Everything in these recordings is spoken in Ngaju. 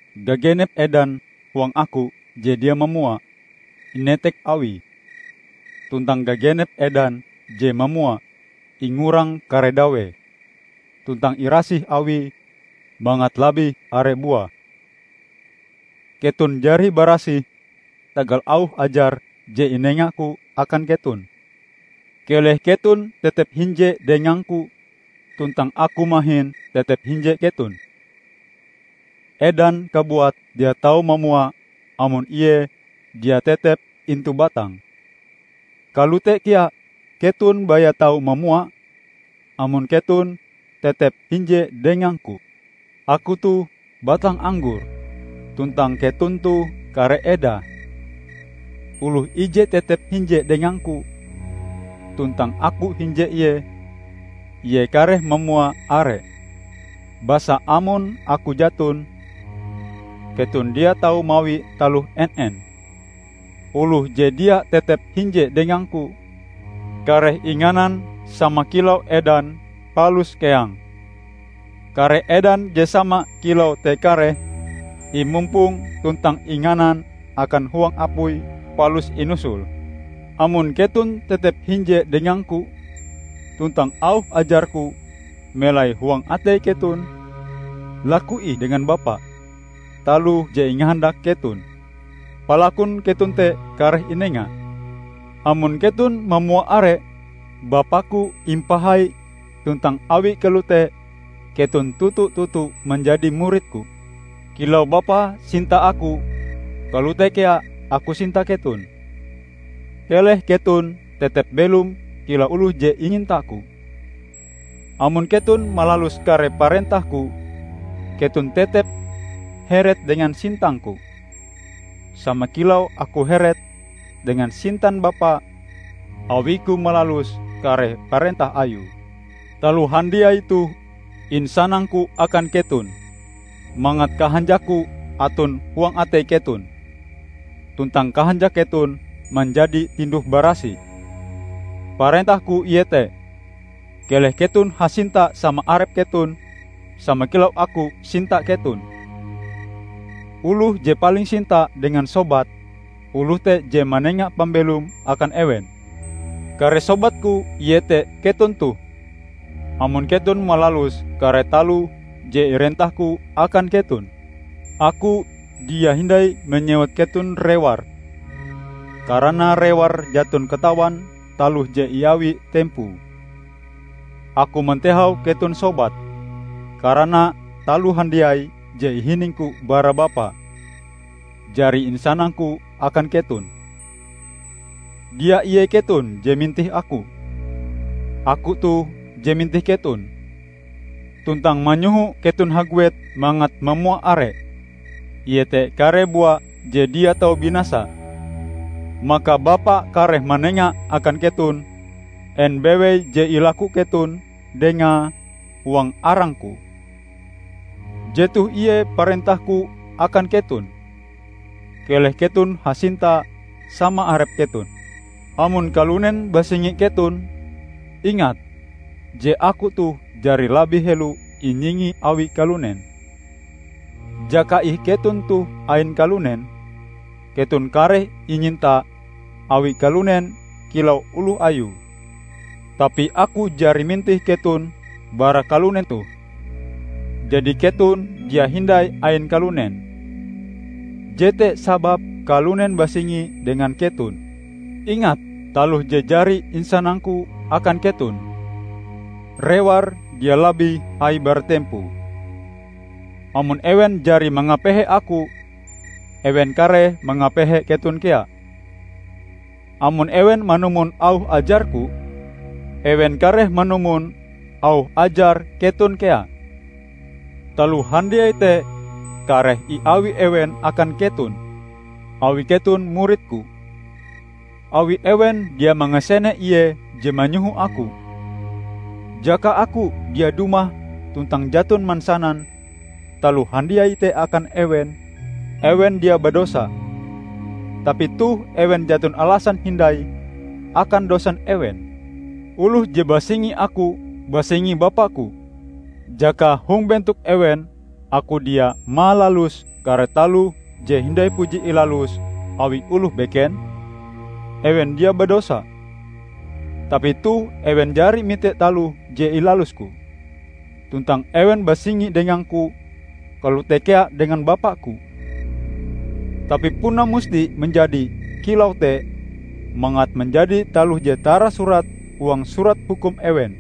Gagenep edan huang Aku je dia mamua, inetek Awie, tuntang gagenep edan je mamua ingurang kare dawee tuntang irasih Awie mangat labih are buae. Keton jari barasih tagal auh ajar je inenga-Ku akan keton. Keleh keton tetep hinje dengang-Ku tuntang Aku mahin tetep hinje keton. Edan kabuat dia tau mamua amon ie dia tetep intu batange. Kalote kea keton baya tau mamua, amon keton tetep hinje dengang-Ku. Aku toh batang anggor, tuntang keton toh kare edae. Oloh ije tetep hinje dengang-Ku tuntang Aku hinje ie, ie kareh mamua are; basa amon Aku jaton, keton dia tau mawi taloh en-en. Oloh je dia tetep hinje dengang-Ku, kareh inganan sama kilau edan palus keang. Kare edan je sama kilau te kareh imumpong tuntang inganan akan huang apui, palus inusul. Amon keton tetep hinje dengang-Ku tuntang auh ajar-Ku melai huang atei keton, laku ih dengan Bapa taloh je ingahandak keton; palakun keton te kareh inenga. Amon keton mamua are, Bapa-Ku impahai; tuntang awi kalote, keton toto-toto manjadi murid-Ku. Kilau Bapa sinta Aku, kalote kea Aku sinta keton. Keleh keton tetep belom kilau oloh je inyinta-Ku. Amon keton malalus kare parentah-Ku, keton tetep heret dengan sintang-Ku sama kilau Aku heret dengan sintan Bapa awi-Ku malalus kare parentah Ayue. Taloh handiai toh insanang-Ku akan keton, mangat kahanjak-Ku aton huang atei keton, tuntang kahanjak keton manjadi tinduh barasih. Parentah-Ku iete: Keleh keton hasinta sama arep keton, sama kilau Aku sinta keton. Oloh je paling sinta dengan sobate, oloh te je manenga pambelome akan ewen. Kare sobat-Ku iete keton toh, amon keton malalus kare taloh je irentah-Ku akan keton. Aku dia hindai manyewut keton rewar karana rewar jaton katawan taloh je iawi tempoe. Aku mantehau keton sobat, karana taloh handiai je ihining-Ku bara Bapa, jari insanang-Ku akan keton. Dia ie keton je mintih Aku. Aku toh je mintih keton, tuntang manyoho keton haguet mangat mamua are -- iete kare bua je dia tau binasa. Maka Bapa kareh manenga akan keton en bewei je ilaku keton dengae huang arang-Ku. Jetoh ie parentah-Ku akan keton: Keleh keton hasinta sama arep keton." "Amon kalunen basingi keton, ingat je Aku toh jari labih helo inyingi awi kalunen. Jaka ih keton toh ain kalunen, keton kareh inyinta awi kalunen kilau oloh ayue. Tapi Aku jari mintih keton bara kalunen toh, jadi keton dia hindai ain kalunen. Jete sababe kalunen basingi dengan keton. Ingat taloh je jari insanang-Ku akan keton, 'Rewar dia labih hai bara tempoe.' Amon ewen jari mangapehe Aku, ewen kareh mangapehe keton kea. Amon ewen manumon auh ajar-Ku, ewen kareh manumon auh ajar keton kea. Taloh handiai te kareh iawi ewen akan keton, awi keton murid-Ku, awi ewen dia mangasene Ie je manyoho Aku. Jaka Aku dia dumah tuntang jaton mansanan taloh handiai te akan ewen, ewen dia badosa. Tapi toh ewen jaton alasan hindai akan dosan ewen. Oloh je basingi Aku, basingi bapa-Ku. Jakae hong bentok ewen Aku dia malalus kare taloh je hindai puji ilalus awi oloh beken, ewen dia badosa. Tapi toh ewen jari mite taloh je ilalus-Ku, tuntang ewen basingi dengang-Ku kalote kea dengan Bapa-Ku. Tapi puna musti manjadi kilau te mangat manjadi taloh je tarasurat huang Surat Hukum ewen,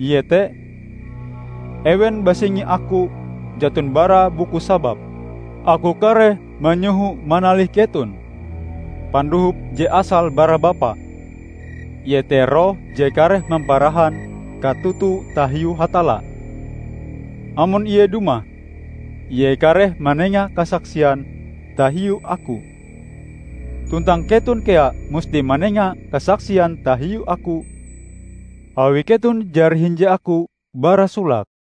iete: 'Ewen basingi Aku jaton bara buku sababe.' Aku kareh manyoho manalih keton, Pandohop je asale bara Bapa, iete Roh je kareh mamparahan katoto tahiu Hatalla. Amon Ie dumah, Ie kareh manenga kasaksian tahiu Aku. Tuntang keton kea musti manenga kasaksian tahiu Aku, awi keton jari hinje Aku bara solake.